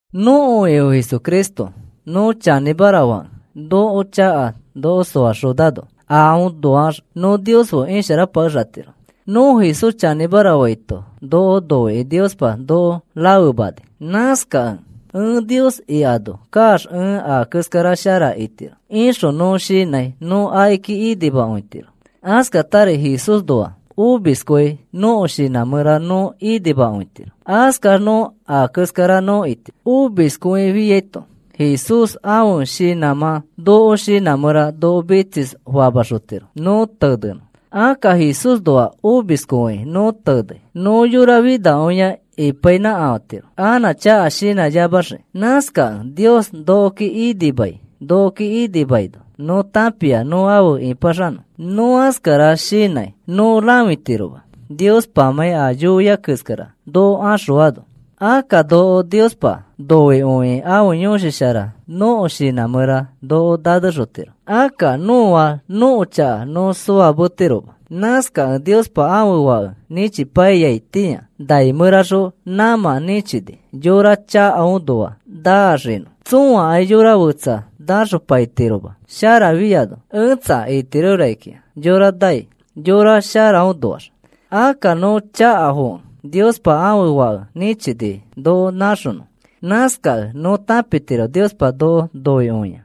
Nõko Ifo Jesucristo nõ chanĩmara fakẽ nõko chaka noko soaxonano aõnoax nõ Nios fe isharapakexatiro. Nõ Jesús chanĩmara faito noko noikĩ Niosya noko rafemani. Nãskakẽ, “Ẽ Nios ikano kaax ẽ a keskara shara itiro,” ixõ nõ shinãi nõ akiki inimakõitiro. Askatari Jesúsnoax omiskõi nõko shinã mẽra nõ inimakõitiro. Askax nõ a keskara nõ itiro. Omiskõifiaito Jesús ãfe shinãmã nõko shinã mẽra noko mitsisfamaxotiro nõ tenenõ. Akka Jesúsnoax omiskõikĩ nõ tenei nõ yora finakõia ipainãkafatiro anã chaka shinãyamaxiki. Nãskakẽ Nios nokoki inimai. Nokoki inimaino nõ tãpia nõ afe ĩpaxanõ. Nõ askara shinãi nõ rãfitiroma Niospamãi a yoia keskara noko axõaino. Akka noko Niospa noikõikĩ ãfe Yõshi Shara nõko shinã mẽra noko nanexotiro. Akka nõa nõko chaka nõ soametiroma. Nãskakẽ Niospa ãfe Fake nĩchipaiyaitĩa nai mẽraxõ nãmã nĩchini yora chakafoõnoax naaxinõ. Tsõakai yora fetsa nãxopaitiroma sharafiano. Ẽtsa, itiro rakikĩa yora nai yora sharafoõnoax. Akka nõ chakafokẽ Niospa ãfe Fake nĩchini noko nãxonõ. Nãskakẽ nõ tãpitiro Niospa noko noikõiai.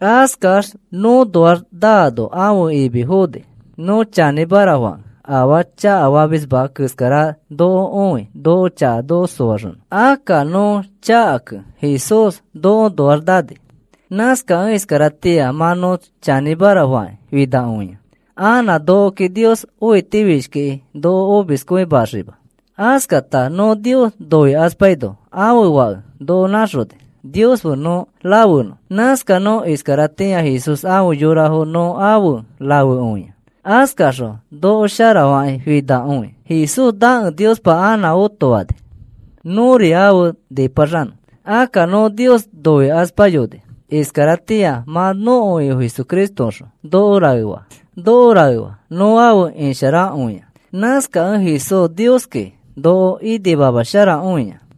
Askax nõõnoax naano ãfe imi foni. Nõ chanĩmara fakẽ afaa chakafamisma keskara noko õi noko chaka soaxõ. Akka nõ chakakẽ Jesús nõõnoax nani. Nãskakẽ iskaratĩa mã nõ chanĩmara fakĩ finakõia. Anã nokoki Nios õitifishkikĩ noko omiskõimaxima. Askata nõ Nios noikaspaino ãfe Fãke noko nãxoni Nios fe nõ rafenõ. Nãskax nõ iskaratĩa Jesús afe yorafo nõ afe rafekõia. Askaxõ noko sharafakĩ finakõi. Jesús nakẽ Niospa anã otofani, nõri afe nipaxanõ. Akka nõ Nios noikaspayoni. Iskaratĩa mã nõko Ifo Jesucristoõxõ noko raefaa nõ afe isharakõia. Nãskakẽ Jesús Nioski noko inimamasharakõia.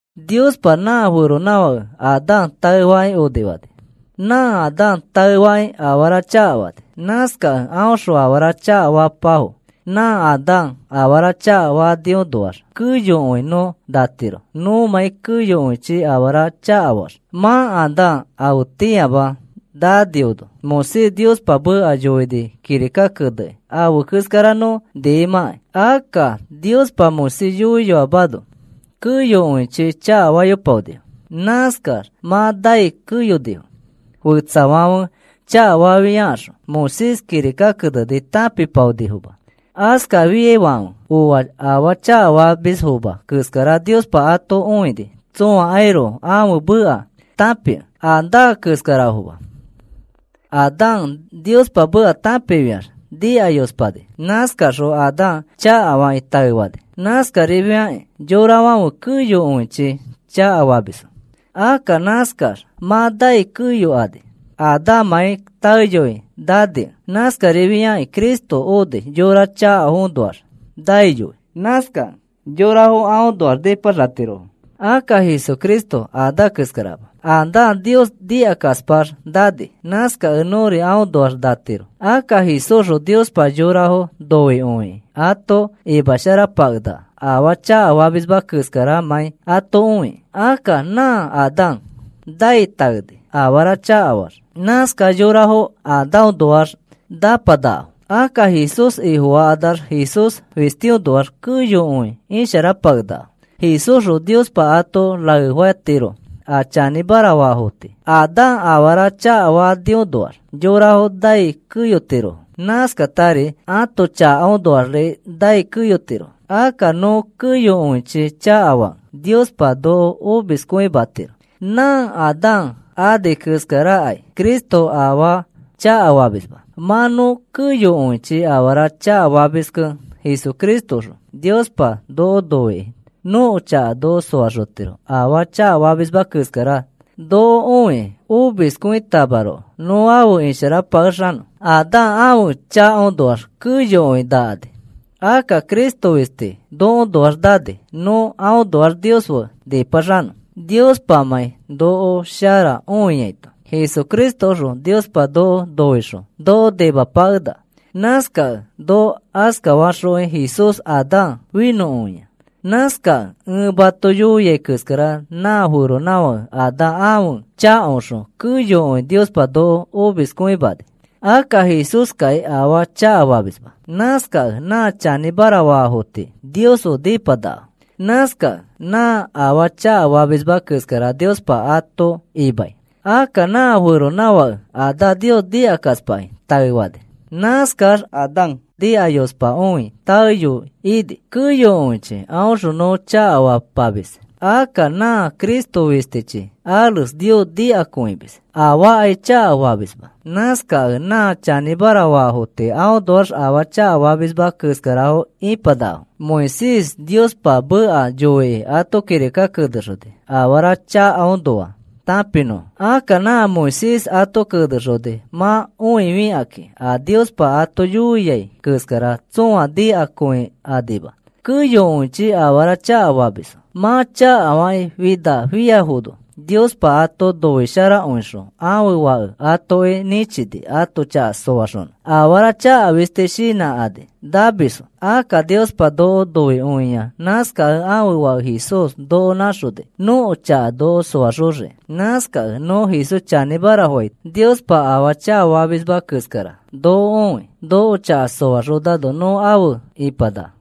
Niospa nã feronãfake Adán taefakĩ onifani. Nã Adán taefakĩ afara chakafani. Nãskakẽ aõxõ afara chakafapafo. Nã Adán afara chakafaniõnoax keyokõi nõ natiro nõmãi keyokõichi afara chakafaax. Mã Adán afetĩama naniano Moisés Niospa meka yoini kirika keneni afe keskara nõ niimãkai. Akka Niospa Moisés yoiyoamano keyokõichi chakafayopaonifo. Nãskax mã nai keyonifo. Fetsafãfe chakafafiakaxõ Moisés kirika keneni tãpipaonifoma. Askafafiaifãfe oa afaa chakafamisfoma keskara Niospa ato õini tsõakairoko ãfe meka tãpikẽ. Adán keskarafoma. Adán Niospa meka tãpifiax nikayospani. Nãskaxõ Adán chakafakĩ taefani. Nãskarifiakĩ yorafãfe keyokõichi chakafamisfo. Akka nãskax mã nai keyokani, Adánmãi taeyoi nanikẽ. Nãskarifiai Cristo oni yora chakafoõnoax naiyoi. Nãskakẽ yorafo aõnoax nĩpaxatirofo. Akka Jesucristo Adán keskarama. Adán Nios nikakaspax nani. Nãskakẽ nõri aõnoax natiro. Akka Jesúsxõ Niospa yorafo noikõikĩ ato imasharapakenaka afaa chakafamisma keskaramãi ato õikĩ. Akka nã Adán nai taeni afara chakafaax. Nãskax yorafo Adánnoax nãpanakafo. Akka Jesús Ifofakanax Jesús fistiõnoax keyokõi isharapakenakafo. Jesúsxõ Niospa ato raefatiro a chanĩmara faafo tii. Adán afara chakafaniõnoax yorafo nai keyotirofo. Nãskatari ãto chakaõnoaxri nai keyotirofo. Akka nõ keyokõichi chakafakẽ Niospa noko omiskõimatiro. Nã Adán ani keskarakai Cristo afaa chakafamisma. Mã nõ keyokõichi afara chakafamiskẽ Jesucristoõxõ Niospa noko noikĩ nõko chaka noko soaxotiro afaa chakafamisma keskara noko õikĩ. Omiskõitamaroko nõ afe isharapakexanõ. Adán ãfe chakafoõnoax keyokõi nakani. Akka Cristo fisti nokoõnoax nani nõ aõnoax Nios fe nĩpaxanõ Niospamãi noko shara õiaito. Jesucristoõxõ Niospa noko noixõ noko nimapakenaka. Nãskakẽ noko askafaxõkĩ Jesús Adán finõkõia. Nãskakẽ ẽ mato yoiai keskara nã feronãfake Adán ãfe chakaõxõ keyokõi Niospa noko omiskõimani. Akka Jesúskai afaa chakafamisma. Nãskakẽ nã chanĩmara faafo tii Nios fe nĩpanakafo. Nãskakẽ nã afaa chakafamisma keskara Niospa ato imai. Akka nã feronãfake Adán Nios nikakaspakĩ taefani. Nãskax Adán nikayospakõi taeyoi ini. Keyokõichi aõxõ nõ chakafapamis. Akka nã Cristo fistichi ares Nios nikakõimis. Afaakai chakafamisma. Nãskakẽ nã chanĩmara faafo tii aõnoax afaa chakafamisma keskarafo ipanakafo. Moisés Niospa meka yoikĩ ato kirika kenexoni afara chakaõnoa tãpinõfo. Akka nã Moisés ato kenexoni mã õifikakĩ a Niospa ato yoia keskara tsõa nikakõikanima. Keyokõichi afara chakafamisfo. Mã chakafakĩ finafiafono Niospa ato noisharakõixõ ãfe Fake atoki nĩchini ato chaka soaxonõ. Afara chaka fisti shinãkani namisfo. Akka Niospa noko noikõia. Nãskakẽ ãfe Fake Jesús noko nãxoni nõko chaka noko soaxoxiki. Nãskakẽ nõ Jesús chanĩmara faito Niospa afaa chakafamisma keskara noko õi. Noko chaka soaxonano nõ afe ipanaka.